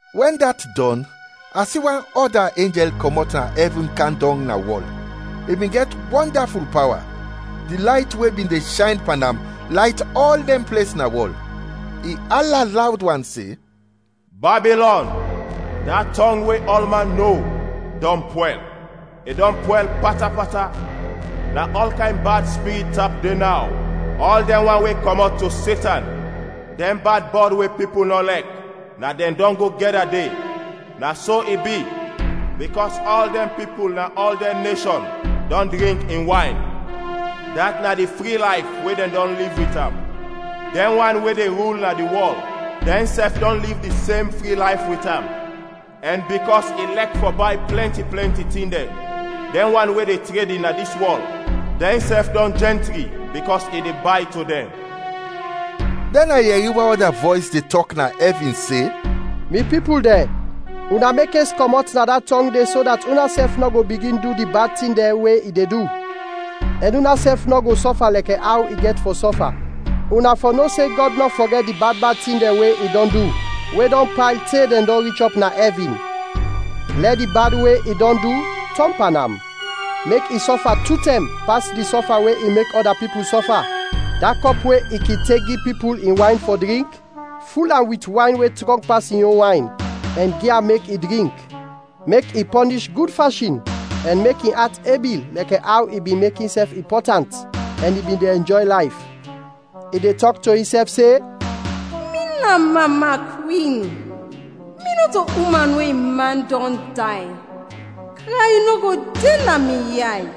Wɛn dat dɔn, a si wan ɔda enjɛl kɔmɔt na ɛvin kam dɔng na wɔl, i bin gɛt wɔndaful pawa. Di layt we bin de shayn pan am, layt ɔl dɛn ples na wɔl. I ala lawd wan se, “Babilɔn, da tɔng we ɔlman no, dɔn pwɛl, i dɔn pwɛl pata pata; na ɔl kayn bad spirit tap de naw, ɔl dɛn wan we kɔmɔt to Setan; dɛn bad bɔd we pipul nɔ lɛk na dɛn dɔn go gɛda de. Na so i bi, bikɔs ɔl dɛn pipul na ɔl dɛn neshɔn dɔn drink in wayn, dat na di fri layf we dɛn dɔn liv wit am; dɛn wan we de rul na di wɔl dɛnsɛf dɔn liv di sem fri layf wit am, ɛn bikɔs i lɛk fɔ bay plɛnti plɛnti tin dɛn, dɛn wan we de tredin na dis wɔl dɛnsɛf dɔn jɛntri bikɔs i de bay to dɛn.” Dɛn a yɛri wan ɔda vɔys de tɔk na ɛvin se, “Mi pipul dɛn, una mekes kɔmɔt na da tɔng de so dat unasɛf nɔ go bigin du di bad tin dɛn we i de du, ɛn unasɛf nɔ go sɔfa lɛkɛ aw i gɛt fɔ sɔfa. Una fɔ no se Gɔd nɔ fɔgɛt di bad bad tin dɛn we i dɔn du, we dɔn payl te dɛn dɔn rich ɔp na ɛvin. Lɛ di bad we i dɔn du tɔn pan am. Mek i sɔfa tu tɛm pas di sɔfa we i mek ɔda pipul sɔfa; da kɔp we i kin tek gi pipul in wayn fɔ drink, ful am wit wayn we trɔng pas in yon wayn, ɛn gi am mek i drink. Mek i pɔnish gud fashin ɛn mek in at ebi lɛkɛ aw i bin mek insɛf impɔtant ɛn i bin de ɛnjɔy layf. I de tɔk to insɛf se, ‘Mi na mama kwin, mi nɔto uman we in man dɔn day; kray nɔ go de na mi yay.’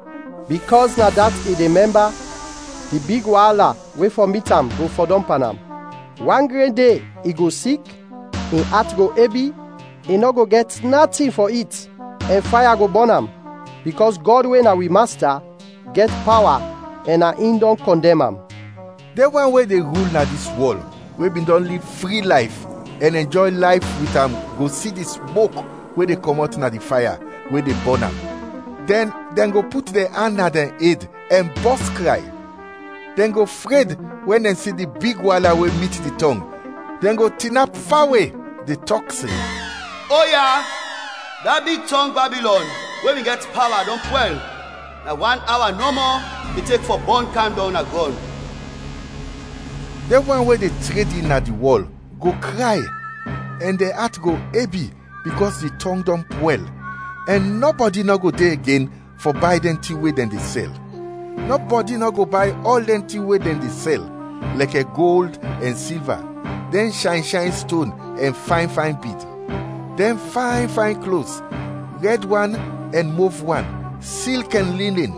Bikɔs na dat i de mɛmba, di big waala we fɔ mit am go fɔdɔm pan am. Wan gren de, i go sik, in at go ebi, i nɔ go gɛt natin fɔ it, ɛn faya go bɔn am. Bikɔs Gɔd we na wi Masta, gɛt pawa ɛn na in dɔn kɔndɛm am.” Dɛn wan we de rul na dis wɔl we bin dɔn liv fri layf ɛn ɛnjɔy layf wit am go si di smok we de kɔmɔt na di faya we de bɔn am, dɛn dɛn go put dɛn an na dɛn ed, ɛn bɔs kray. Dɛn go fred wɛn dɛn si di big waala we mit di tɔng, dɛn go tinap fawe, de tɔk se, “Oya, da big tɔng, Babilɔn, we bin gɛt pawa, dɔn pwɛl; na wan awa nɔmɔ i tek fɔ bɔn kam dɔng na grɔn.” Dɛn wan we de tredin na di wɔl go kray ɛn dɛn at go ebi bikɔs di tɔng dɔn pwɛl, ɛn nɔbɔdi nɔ go de igen fɔ bay dɛn tin we dɛn de sɛl; nɔbɔdi nɔ go bay ɔl dɛn tin we dɛn de sɛl, lɛkɛ gold ɛn silva, dɛn shayn shayn ston ɛn fayn fayn bid; dɛn fayn fayn klos, rɛd wan ɛn mov wan, silk ɛn linin;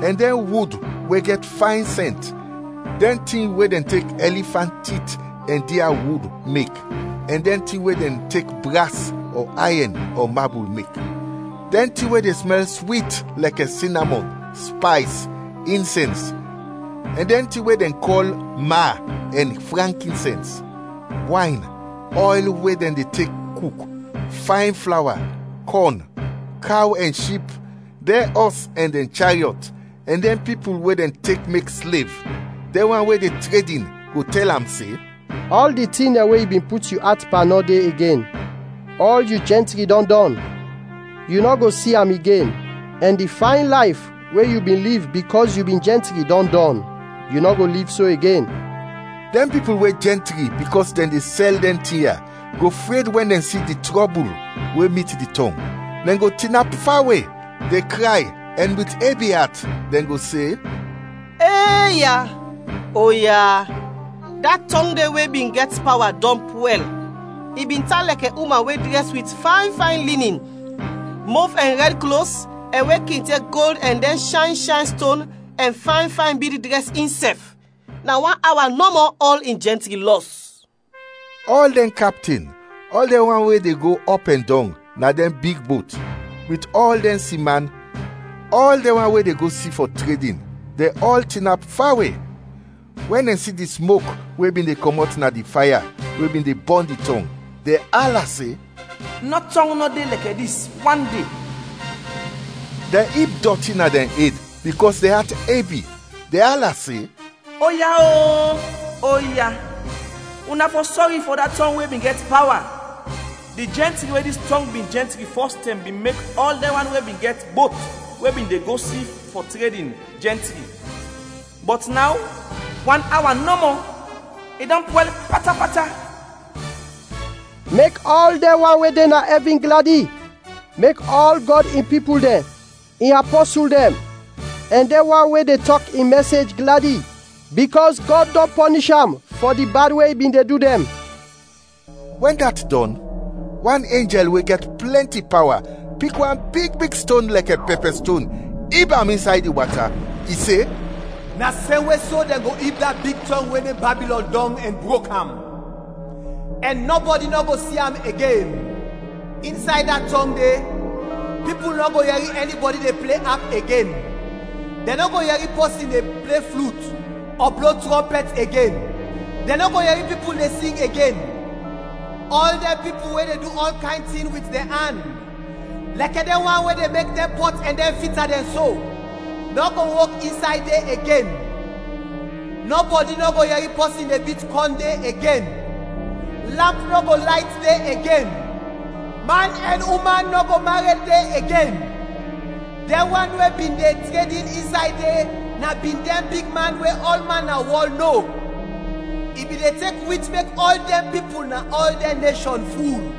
ɛn dɛn wud we gɛt fayn sɛnt, dɛn tin we dɛn tek ɛlifant tit ɛn dia wud mek ɛn dɛn tin we dɛn tek bras ɔ ayɛn ɔ mabul mek; dɛn tin we de smɛl swit lɛkɛ sinamɔn, spays, insɛns, ɛn dɛn tin we dɛn kɔl ma ɛn frankinsɛns; wayn, ɔyl we dɛn de tek kuk, fayn flawa, kɔn, kaw ɛn ship, dɛn ɔs ɛn dɛn chariɔt, ɛn dɛn pipul we dɛn tek mek slev. Dɛn wan we de tredin go tɛl am se, “Ɔl di tin dɛn we yu bin put yu at pan nɔ de igen; ɔl yu jɛntri dɔn dɔn, yu nɔ go si am igen, ɛn di fayn layf we yu bin liv bikɔs yu bin jɛntri dɔn dɔn, yu nɔ go liv so igen.” Dɛn pipul we jɛntri bikɔs dɛn de sɛl dɛn tin ya go fred wɛn dɛn si di trɔbul we mit di tɔng, dɛn go tinap fawe, de kray ɛn wit ebi at, dɛn go se, “Eeya, oya! Da tɔng de we bin gɛt pawa, dɔn pwɛl, i bin tan lɛkɛ uman we drɛs wit fayn fayn linin, mov ɛn rɛd klos ɛn we kin tek gold ɛn dɛn shayn shayn ston ɛn fayn fayn bid drɛs insɛf! Na wan awa nɔmɔ ɔl in jɛntri lɔs!” Ɔl dɛn kapten, ɔl dɛn wan we de go ɔp ɛn dɔng na dɛn big bot, wit ɔl dɛn siman, ɔl dɛn wan we de go si fɔ tredin, dɛn ɔl tinap fawe; wɛn dɛn si di smok we bin de kɔmɔt na di faya we bin de bɔn di tɔng, dɛn ala se, “Nɔ tɔng nɔ de lɛkɛ dis wande!” Dɛn ib dɔti na dɛn ed bikɔs dɛn at ebi, dɛn ala se, “Oya o! Oya, una fɔ sɔri fɔ da tɔng we bin gɛt pawa. Di jɛntri we dis tɔng bin jɛntri fɔs tɛm bin mek ɔl dɛn wan we bin gɛt bot we bin de go si fɔ tredin, jɛntri. Bɔt naw, wan awa nɔmɔ, i dɔn pwɛl pata pata.” Mek ɔl dɛn wan we de na ɛvin gladi, mek ɔl Gɔd in pipul dɛn, in apɔsul dɛn, ɛn dɛn wan we de tɔk in mɛsej gladi bikɔs Gɔd dɔn pɔnish am fɔ di bad we i bin de du dɛn. Wɛn dat dɔn, wan enjɛl we gɛt plɛnti pawa pik wan big big ston lɛkɛ pɛpɛ ston ib am insay di wata, i se, “Na semwe so dɛn go ib da big tɔng we nem Babilɔn dɔng ɛn brok am, ɛn nɔbɔdi nɔ go si am igen. Insay da tɔng de, pipul nɔ go yɛri ɛnibɔdi de ple ap igen, dɛn nɔ go yɛri pɔsin de ple flut ɔ blo trɔmpɛt igen, dɛn nɔ go yɛri pipul de sing igen; ɔl dɛn pipul we de du ɔl kayn tin wit dɛn an, lɛkɛ dɛn wan we de mek dɛn pɔt ɛn dɛn fita dɛn so, nɔ go wok insay de igen. Nɔbɔdi nɔ go yɛri pɔsin de bit kɔn de igen; lamp nɔ go layt de igen; man ɛn uman nɔ go mared de igen. Dɛn wan we bin de tredin insay de na bin dɛn bigman we ɔlman na wɔl, no. I bin de tek wich mek ɔl dɛn pipul na ɔl dɛn neshɔn ful.”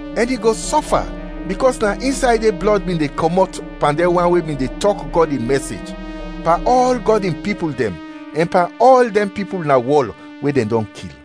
Ɛn i go sɔfa bikɔs na insay de blɔd bin kɔmɔt pan dɛn wan we bin de tɔk Gɔd in mɛsej, pan ɔl Gɔd in pipul dɛn, ɛn pan ɔl dɛn pipul na wɔl we dɛn dɔn kil.